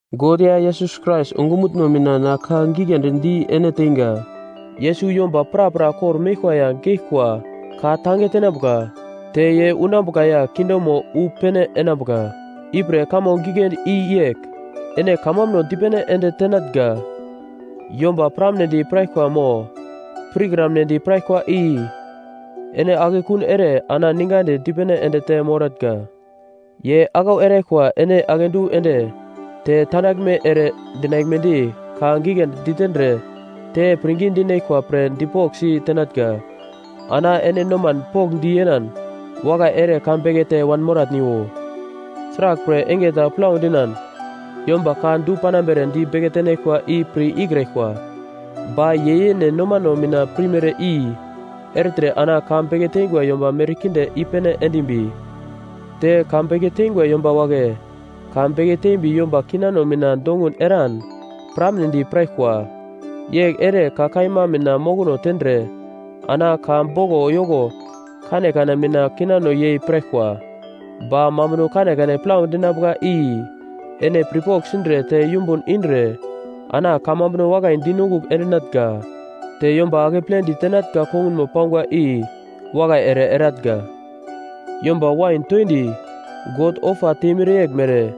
God ya Yesus Krais ongumutno mina na ka giglendi di ene teinga. Yesus yomba prapra kor-meglkwa ya geglkwa ka-tange tenambuka, te ye unambuka ya kingdomo wu pene enambuka. Ipre kamo giglendi i yegl: Ene kamambuno dipene ende tenatnga. Yomba piramnedi piraglkwa mo pirkramnedi piraglkwa i ene akekun ere ana ningadi dipene ende te moratnga. Ye aglau eraglkwa ene akedu ende, te tandaglme ere dinaglmedi ka giglendi ditendre te pirngi dinaglkwa pre dipoglsi tenatnga. Ana ene noman pokndi yenan wakai ere ka bekete wanmoratniwo. Sraglpre enge ta plau dinan yomba ka du-panambere di beke tenaglkwa i pir ikraglkwa. Ba ye yene nomano mina pirmere i ertre ana ka beke teingwa yomba merkinde i-pene endimbi, te ka beke teingwa yomba wagle ka beke tembi yomba kinano mina dongun eran piramnedi piraglkwa. Yegl ere ka kaima mina mokono tendre ana ka boglo yoko kanekane mina kinano yei piraglkwa. Ba mambuno kanekane plau dinambuka i ene pirpogl sindre te yumbun indre ana kamambuno wakai dinongugl endinatnga. Te yomba akeple ditenatnga kongunmo pangwa i wakai ere eratnga. Yomba wain toindi God ofa temere yeglmere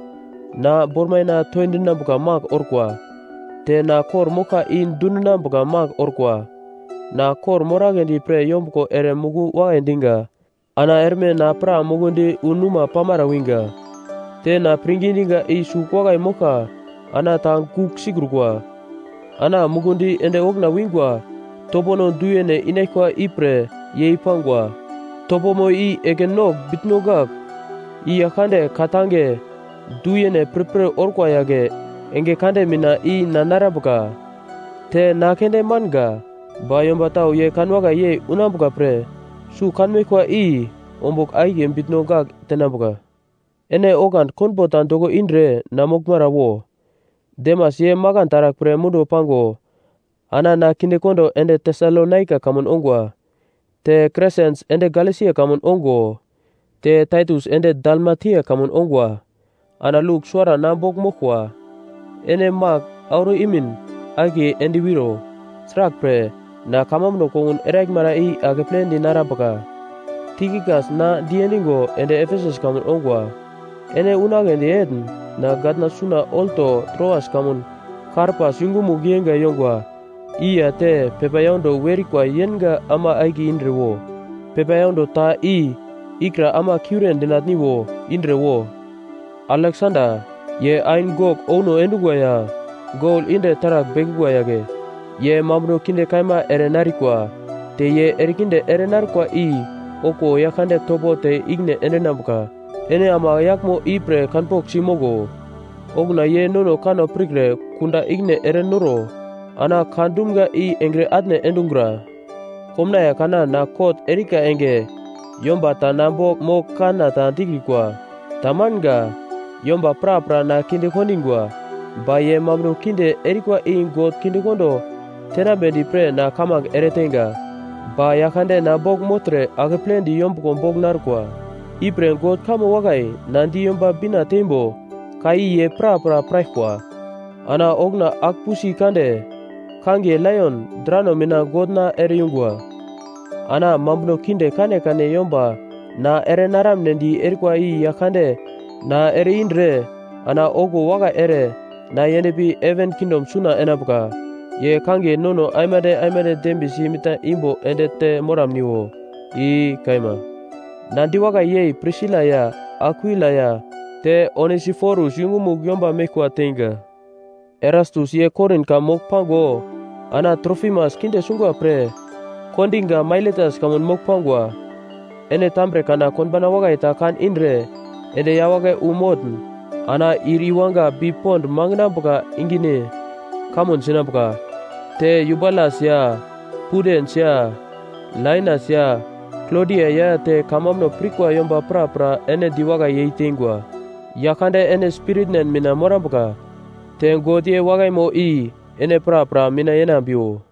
na bormaina toindinambuka magl orkwa. Te na kor-moglka i dundinambuka magl orkwa. Na kor-moragledi pre yombuglo ere muku wakai diga. Ana erme na pra mukundi wu numa pamara winga. Te na pirngi diga i sugl wakai moglka ana ta gugl sikrukwa. Ana mukundi ende okuna wingwa topono du-yene inaglkwa ipre yei-pangwa; topomo i ekin nogl bitno gagl, i Yaglkande ka tange du-yene pirpir orkwa yagle enge kande mina i na narambuka. Te na keunde manga, ba yomba tau ye kanwakai yei unambuka pre sugl kanmeglkwa i ombugl akiye bitno gagl tenambuka. Ene oglandi konbo ta doko indre na moglmara wo. Demas ye makan taragl pre munduwo pango ana na kinde kondo ende Tesalonaika kamun ongwa. Te Kresens ende Galesia kamun ongo, te Taitus ende Dalmatia kamun ongwa. Ana Luk suwara na bogl moglkwa. Ene Mak auro imin akiye endwiro. Sraglpre, na kamambuno kongun eraglmara i akeple dinarambuka. Tikikas na diendigo ende Efesus kamun ongwa. Ene unagledi etn na gatna suna olto Troas kamun Karpas yungumugl yeinga yongwa i ya te pepa yaundo werikwa yenga ama akiye indre wo. Pepa yaundo ta i ikra ama kiure dinatniwo indre wo. Aleksanda, ye ain gogl ouno endungwa ya gol indre taragl bekungwa yagle, ye mambuno kinde kaima ere narikwa. Te ye erekinde ere narkwa i okuwo Yaglkande topo te ikine endinambuka. Ene ama yaglmo ipre kanpoglsi moglo. Okuna ye nono kanno pirkre kunda ikine erenoro ana ka dumga i engre atne endungura. Komnaiye kana na kot erika enge yomba ta na bogl mogl kanna ta dikrikwa, tamanga. Yomba prapra na kinde kondingwa. Ba ye mambuno kinde erikwa i God kindekondo tenambedi pre na kamange ereteinga. Ba Yaglkande na bogl mogltre akepledi yombuglo bogl narkwa. Ipre God kamo wakai na di Yomba Bina teimbo ka i ye prapra piraglkwa. Ana okuna agl-pusi kande kangiye laion drano mina God na ere-yungwa. Ana mambuno kinde kanekane yomba na erenaramunedi erikwa i Yaglkande na ere-indre ana okuwo wakai ere na yendpi heven kingdom suna enambuka. Ye kangiye nono aimande aimande dembiyesi mitna imbo ende te moramniwo. I kaima. Na diwakai yei Prisila ya Akwila ya te Onesiforus yungumugl yomba meglkwa teinga. Erastus ye Korin kamun mogl pago ana Trofimas kinde sungwa pre kondiga Mailetas kamun mogl pangwa. Ene tambre kana konbauna wakai ta kan indre ende yawagle wu motn ana ir iwanga bi pond mangenambuka ingine kamun sinambuka. Te Yubulas ya Pudens ya Lainas ya Klodia ya te kamambuno pirkwa yomba prapra ene diwakai yeiteingwa. Yaglkande ene spiritn mina morambuka. Te God ye wakaimo i ene prapra mina yenambiwo.